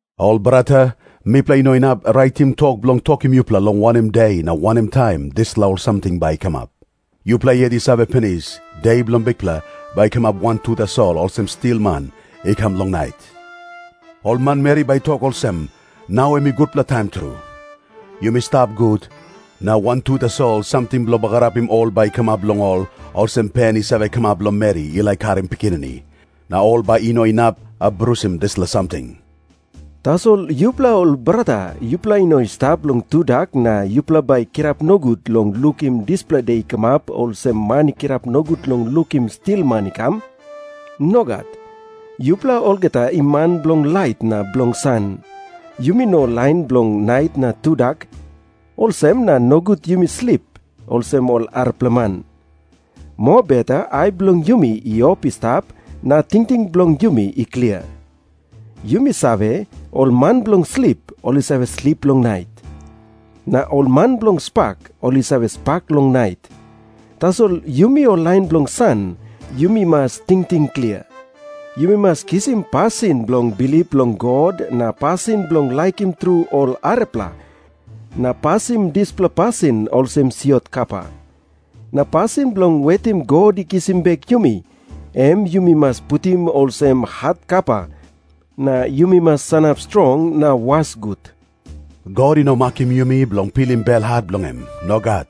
Ol brata, mipela i no inap raitim tok bilong tokim yupela long wanem de na wanem taim dispela ol samting bai i kamap. Yupela yet i save pinis, De bilong Bikpela bai i kamap wantu tasol olsem stilman i kam long nait. Ol manmeri bai i tok olsem, “Nau em i gutpela taim tru. Yumi stap gut,” na wantu tasol samting bilong bagarapim ol bai i kamap long ol, olsem pen i save kamap long meri i laik karim pikinini. Na ol bai i no inap abrusim dispela samting. Tasol yupela ol brata yupela i no i stap long tudak, na yupela bai i kirap nogut long lukim dispela de i kamap, olsem man i kirap nogut long lukim stilman i kam. Nogat. Yupela olgeta i man bilong lait na bilong san. Yumi no ol lain bilong nait na tudak. Olsem na nogut yumi slip, olsem ol arapela man. Mobeta ai bilong yumi i op i stap, na tingting bilong yumi i klia. Yumi save, ol man bilong slip, ol i save slip long nait. Na ol man bilong spak, ol i save spak long nait. Tasol yumi ol lain bilong san, yumi mas tingting klia. Yumi mas kisim pasin bilong bilip long God na pasin bilong laikim tru ol arapela, na pasim dispela pasin olsem siot kapa. Na pasin bilong wetim God i kisim bek yumi, em yumi mas putim olsem hat kapa, na yumi mas sanap strong na was gut. God i no makim yumi bilong pilim belhat bilong em. Nogat.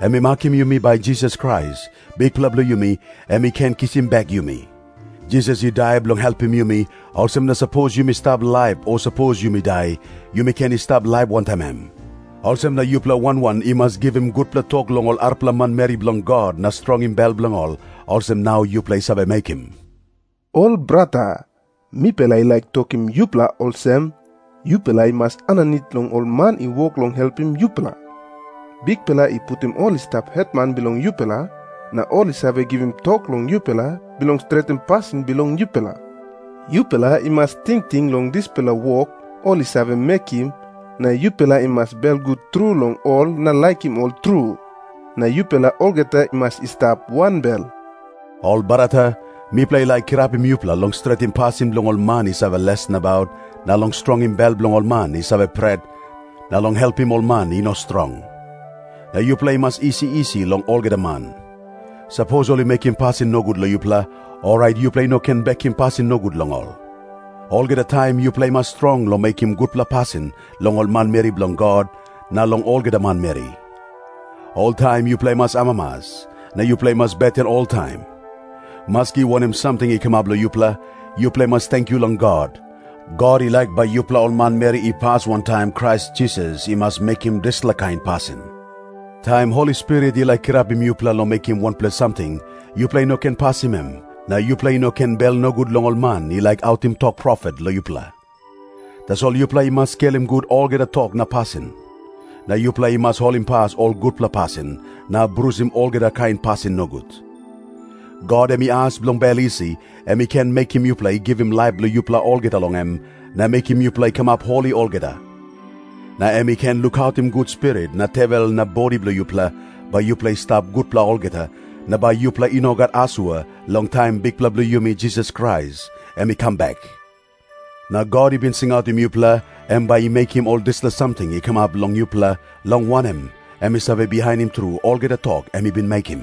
Em i makim yumi bai Jisas Krais, Bikpela bilong yumi, em i ken kisim bek yumi. Jisas i dai bilong helpim yumi, olsem na sapos yumi stap laip o sapos yumi dai, yumi ken i stap laip wantaim em. Olsem na yupela wan wan i mas givim gutpela tok long ol arapela manmeri bilong God na strongim bel bilong ol, olsem nau yupela i save mekim. Ol brata, mipela i laik tokim yupela olsem, yupela i mas aninit long ol man i wok long helpim yupela. Bikpela i putim ol i stap hetman bilong yupela, na ol i save givim tok long yupela bilong stretim pasin bilong yupela. Yupela i mas tingting long dispela wok ol i save mekim, na yupela i mas belgut tru long ol na laikim ol tru. Na yupela olgeta i mas i stap wanbel. Ol brata, mipela i laik kirapim yupela long stretim pasin bilong ol man i save les nabaut na long strongim bel bilong ol man i save pret na long helpim ol man i no strong. Na yupela i mas isi isi long olgeta man. Sapos ol i mekim pasin nogut long yupela, orait yupela i no ken bekim pasin nogut long ol. Olgeta taim yupela i mas strong long mekim gutpela pasin long ol manmeri bilong God na long olgeta manmeri. Oltaim yupela i mas amamas, na yupela i mas beten oltaim. Maski wanem samting i kamap long yupela, yupela i mas tenkyu long God. God i laik bai yupela ol manmeri i pas wantaim Krais Jisas i mas mekim dispela kain pasin. Taim Holi Spirit i laik kirapim yupela long mekim wanpela samting, yupela i no ken pasim em, na yupela i no ken bel nogut long ol man i laik autim tok profet long yupela. Tasol yupela i mas skelim gut olgeta tok na pasin. Na yupela i mas holimpas ol gutpela pasin na abrusim olgeta kain pasin nogut. God em i as bilong bel isi, em i ken mekim yupela i givim laip bilong yupela olgeta long em, na mekim yupela i kamap holi olgeta. Na em i ken lukautim gut spirit na tewel na bodi bilong yupela, bai yupela i stap gutpela olgeta, na bai yupela i no gat asua long taim Bikpela bilong yumi Jisas Krais em i kam bek. Na God i bin singautim yupela, em bai i mekim ol dispela samting i kamap long yupela, long wanem, em i save bihainim tru olgeta tok em i bin mekim.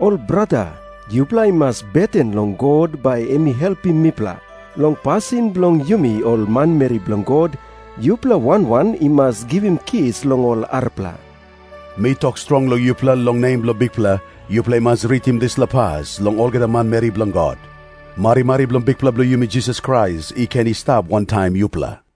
Ol brata, yupela i mas beten long God bai em i helpim mipela. Long pasin bilong yumi ol manmeri bilong God, yupela wan wan i mas givim kis long ol arapela. Mi tok strong long yupela long nem bilong Bikpela, yupela i mas ritim dispela pas long olgeta manmeri bilong God. Marimari bilong Bikpela bilong yumi Jisas Krais i ken i stap wantaim yupela.